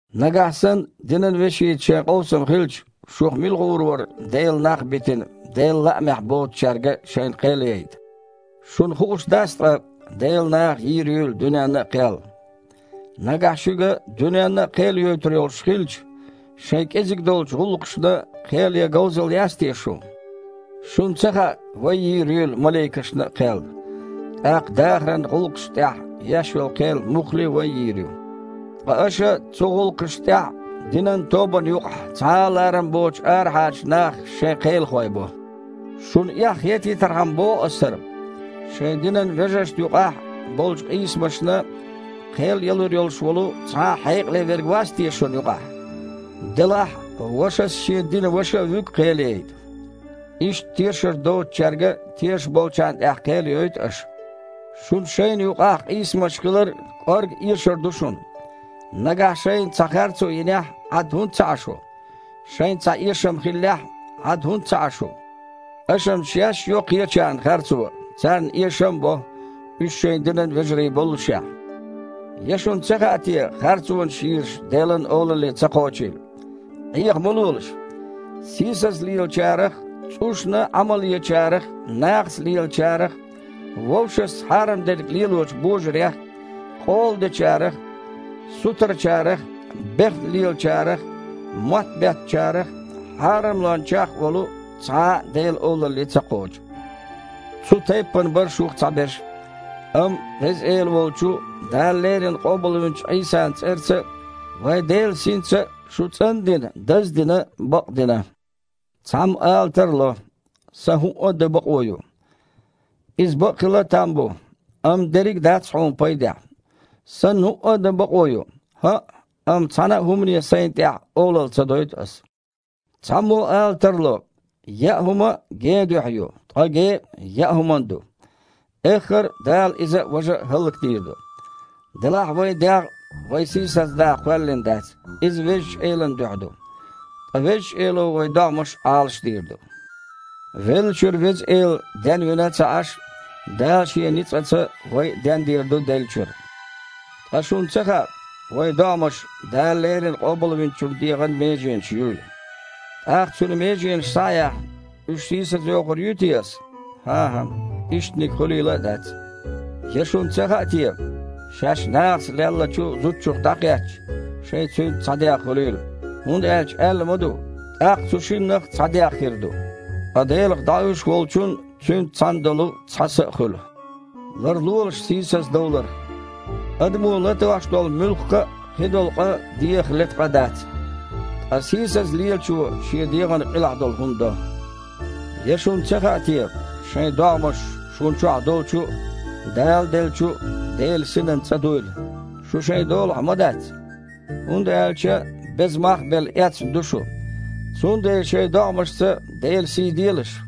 Нагахь санна динан вешица шайн къовсам хилча, шух мила гІур вара, Делан нах а битина, Делан лаамехь боцучаьрга шайна кхел яйта? Шуна хууш дац ткъа, Делан наха йийр юйла дуьненна а кхел? Нагахь шуьга дуьненна а кхел йойтур йолуш хилча, шайн кІезиг долчу гІуллакхашна кхел ян говзалла яц те шун? Шуна ца хаьа, вай йийр юйла маликашна а кхел? ТІаккха дахаран гІуллакхашна тІехь еш йолу кхел-м муххале а вай йийр ю. Ткъа аша цу гІуллакхашна тІехь а динан тобанна юкъахь цхьа а ларам боцучу арахьарчу нахах шайн кхелахой бо! Шуна эхь хетийтархьама боху ас хІара: шайн динан вежаршна юкъахь болчу къийсамашна кхел ялур йолуш волу цхьа а хьекъале верг вац те шуна юкъахь? Делахь а вашас шен динан ваша а вуьгу кхел яйта. Иштта тешар доцучаьрга тешаш болчарна тІехь кхел йойту аша! Шуна шайна юкъахь къийсамаш хилар а кІорга эшар ду шуна. Нагахь шайна цхьа харцо йинехь а, Іад хІунда ца Іа шу? Шайна цхьа эшам хиллехь а, Іад хІунда ца Іа шу? Аша-м шаьш а йо кхечарна харцо, царна эшам а бо, уьш шайн динан вежарий боллушехь! Я шуна ца хаьа те, харцонаш йийраш Делан Олалле ца кхочийла? Іеха ма лолаш! Сийсаза лелачарах а, цІушна Іамал ечарах а, нахаца лелачарах а, вовшашца хьарам дерг лелочу божарех а, къола дечарах а, сутарачарах а, бехна лелачарах а, мотт беттачарах а, хьарамлончех а волу цхьа а Делан Олалле ца кхочу. Цу тайппана бара шух цхьаберш а. Амма Веза Эла волчу, Дала леррина къобалвинчу Іийсан цІарца а, вайн Делан Синца а шу цІан а дина, даз а дина, бакъ а дина. Цхьаммо ала тарло: «Сан хІуъа а дан бакъо ю». Иза бакъ хила там бу, амма дерриг а дац хьуна пайдехь. «Сан хІуъа а дан бакъо ю». ХІаъ, амма цхьана а хІумане сайна тІехь олалла ца дойту аса. Цхьаммо ала тарло: «Яа хІума а – ген дуьхьа ю, ткъа ге а – яа хІуманна ду. Эххар а Дала иза а, важа а хІаллакдийр ду». Делахь а вайн дегІ вай сийсаздаха кхоьллина дац, иза Везачу Элан дуьхьа ду. Ткъа Везачу Эло вайн догІмаш Іалашдийр ду. Веллачуьра Веза Эла денвина а ца Іаш, Дала Шен ницкъаца вай а дендийр ду деллачуьра. Ткъа шуна ца хаьа, вайн догІмаш Дала леррина Къобалвинчун дегІан меженаш юйла? ТІаккха, Цуьнан меженаш схьа а яьхна, уьш сийсазйохур юй те ас? ХІан-хІа, иштаниг хуьлийла а дац! Я шуна ца хаьа те, шаьш нахаца леллачу зудчух дІакхетча, шайн цуьнца цхьа дегІ хуьлийла. ХІунда аьлча аьлла ма ду: «ТІаккха цу шиннах цхьа дегІ хир ду». Ткъа Делах дІауьйш волчун Цуьнца цхьаьна долу цхьа са а хуьлу. Ларлолаш сийсаздовларх! Адамо латош долу муьлхха а кхидолу къа дегІах лета къа дац. Ткъа сийсаза лелачо шен дегІана къилахь долу хІума до. Я шуна ца хаьа те, шайн догІмаш шуна чохь долчу а, Дала делла долчу а Делан Синан цІа дуйла? Шу шайн долахь ма дац! ХІунда аьлча, беза мах а белла, эцна ду шу. Цундела шайн догІмашца Делан сий делаш!